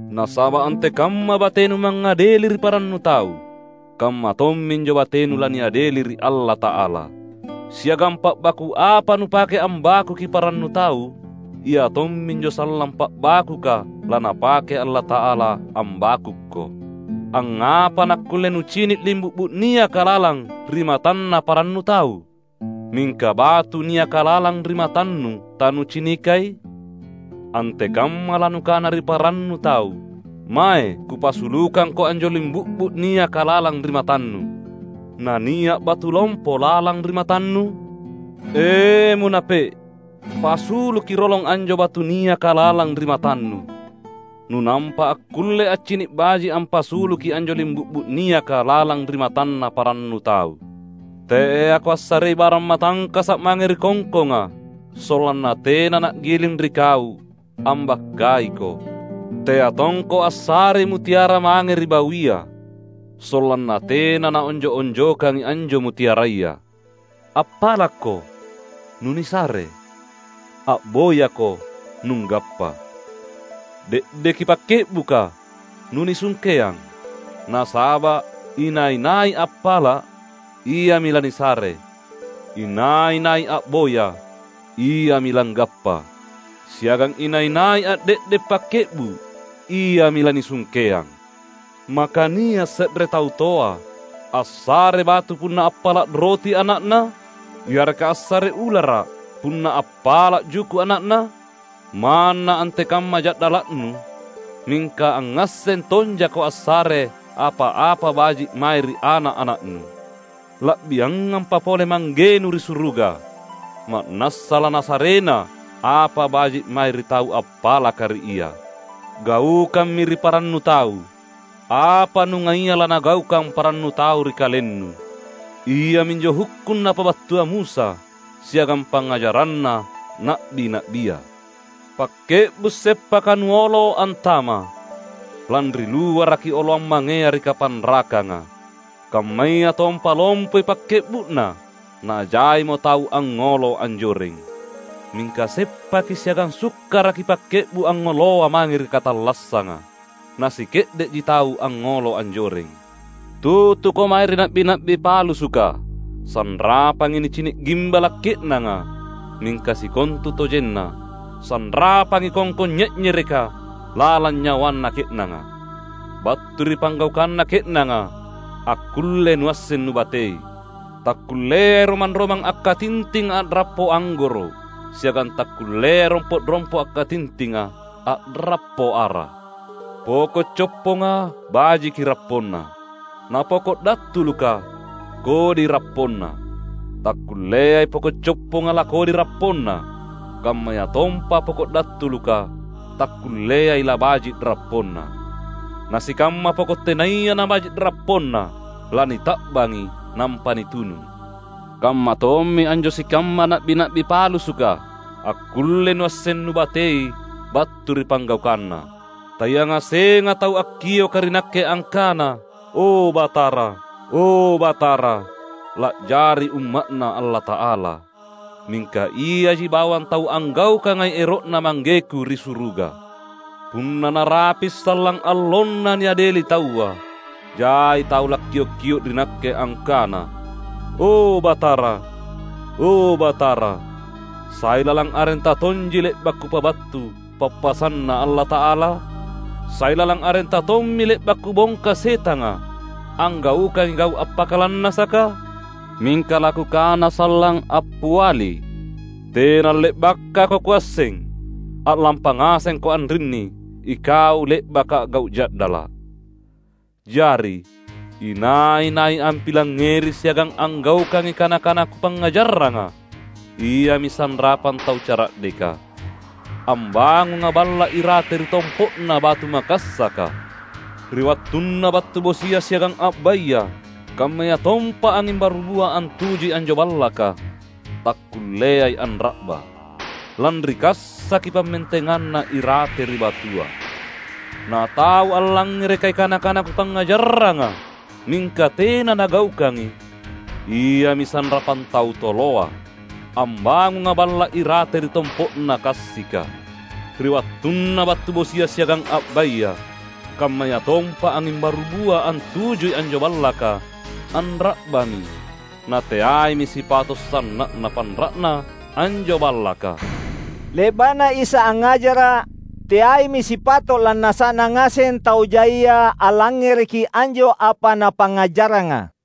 Nasaba’ antekamma batenu mangngadeli ri parannu tau, kamma tomminjo batenu laniadeli ri Allata’ala. Siagang pa’baku’ apa nupake ambakuki parannu tau, ia tomminjo sallang pa’bakuka laNapake Allata’ala ambakukko. Angngapa nakkulle nucini’ limbu’bu’ niaka lalang ri matanna parannu tau, mingka batu niaka lalang ri matannu tanucinikai? Antekamma lanukana ri parannu tau, ‘Mae kupasulukangko anjo limbu’bu’ niaka lalang ri matannu,’ nania’ batu lompo lalang ri matannu? E, munape’! Pasuluki rolong anjo batu niaka lalang ri matannu, nunampa akkulle accini’ baji’ ampasuluki anjo limbu’bu’ niaka lalang ri matanna parannu tau. Teako assarei barang matangkasa’ mange ri kongkonga, sollanna tena na’giling ri kau ambakkaiko. Tea tongko assarei mutiara mange ri bawia, sollanna tena naonjo’-onjokangi anjo mutiaraya." "Appalakko, nunisare. A’boyako, nunggappa. De’deki pakke’buka, nunisungkeang. Nasaba’ inai-nai appala’, iami lanisare; inai-nai a’boya, iami langgappa; siagang inai-nai ande’de’ pakke’bu’, iami lanisungkeang. Maka nia’ se’re tau toa assare batu punna appala’ roti ana’na? Yareka assare ulara’ punna appala’ juku’ ana’na? Manna antekamma ja’dala’nu mingka angngasseng tonjako assare apa-apa baji’ mae ri ana’-ana’nu. La’biangampa pole Manggenu ri suruga, ma’nassa laNasarena apa baji’ mae ri tau appalaka ri Ia. Gaukammi ri parannu tau apa nungaia lanagaukang parannu tau ri kalennu. Iaminjo hukkung napabattua Musa, siagang pangngajaranna na’bi-na’bia." "Pakke’bu’ seppaka nuolo antama, lanri luaraki oloang mangea ri kapanrakanga, kammayatompa lompoi pakke’bu’na, najaimo tau angngolo anjoreng. Mingka seppaki siagang sukkaraki pakke’bu’ angngoloa mange ri katallassanga, nasike’de’ji tau angngolo anjoreng." "Tutuko mae ri na’bi-na’bi palassua. Sanrapangi nicini’ gimbala’ ke’nanga, mingka sikontutojenna sanrapangi kongkong nye’nyereka lalang nyawana ke’nanga. Battu ri panggaukanna ke’nanga akkulle nuasseng nubatei. Takkulleai romang-romang akkatintinga a’rappo anggoro’; siagang takkulleai rompo’-rompo’ akkatintinga a’rappo ara. Poko’ copponga bajiki rapponna, napoko’ dattuluka kodi rapponna. Takkulleai poko’ copponga lakodi rapponna, kammayatompa poko’ dattuluka takkulleai labaji’ rapponna. Nasikamma poko’ tenaya nabaji’ rapponna lanita’bangi nampa nitunu. Kammatommi anjo sikamma na’bi-na’bi palassua. Akkullei nuasseng nubatei battu ri panggaukanna." "Tayangasenga tau akkioka ri Nakke angkana, ‘O, Batara, o, Batara,’ la’jari umma’Na Allata’ala; mingka iaji bawang tau anggaukangai ero’Na ManggeKu ri suruga. Punna narapi’ sallang allonna niadeli taua, jai tau lakkiok-kio’ ri Nakke angkana, ‘O, Batara, o, Batara, sai lalang arenTa tonji le’ba’ kupabattu pappasanNa Allata’ala? Sai lalang arenTa tommi le’ba’ kubongka setanga, anggaukangi gau’ appakalannasaka?’ Mingka laKukana sallang appiali, ‘Tena le’bakako Kuasseng! A’lampa ngasengko anrinni ikau le’baka a’gau’ ja’dala’!’" "Jari, inai-nai ampilangngeri siagang anggaukangi kana-kana Kupangngajarranga, iami sanrapang tau cara’deka, ambangunga balla’ irate ri tompo’na batu makassaka. Ri wattunna battu bosia siagang a’baya kammayatompa anging barubua antujui anjo ballaka takkulleai anra’ba, lanri kassaki pammentenganna irate ri batua. Na tau allangngerekai kana-kana Kupangngajarranga mingka tena nagaukangi, iami sanrapang tau toloa, ambangunga balla’ irate ri tompo’na kassika. Ri wattunna battu bosia siagang a’baya kammayatompa anging barubua antujui anjo ballaka, anra’bami. Nateaimi sipato’ sanna’na panra’na anjo ballaka!" Le’ba’na Isa angngajara’, teaimi sipato’ lannasa’na ngaseng tau jaia allangngereki anjo apa Napangngajarranga.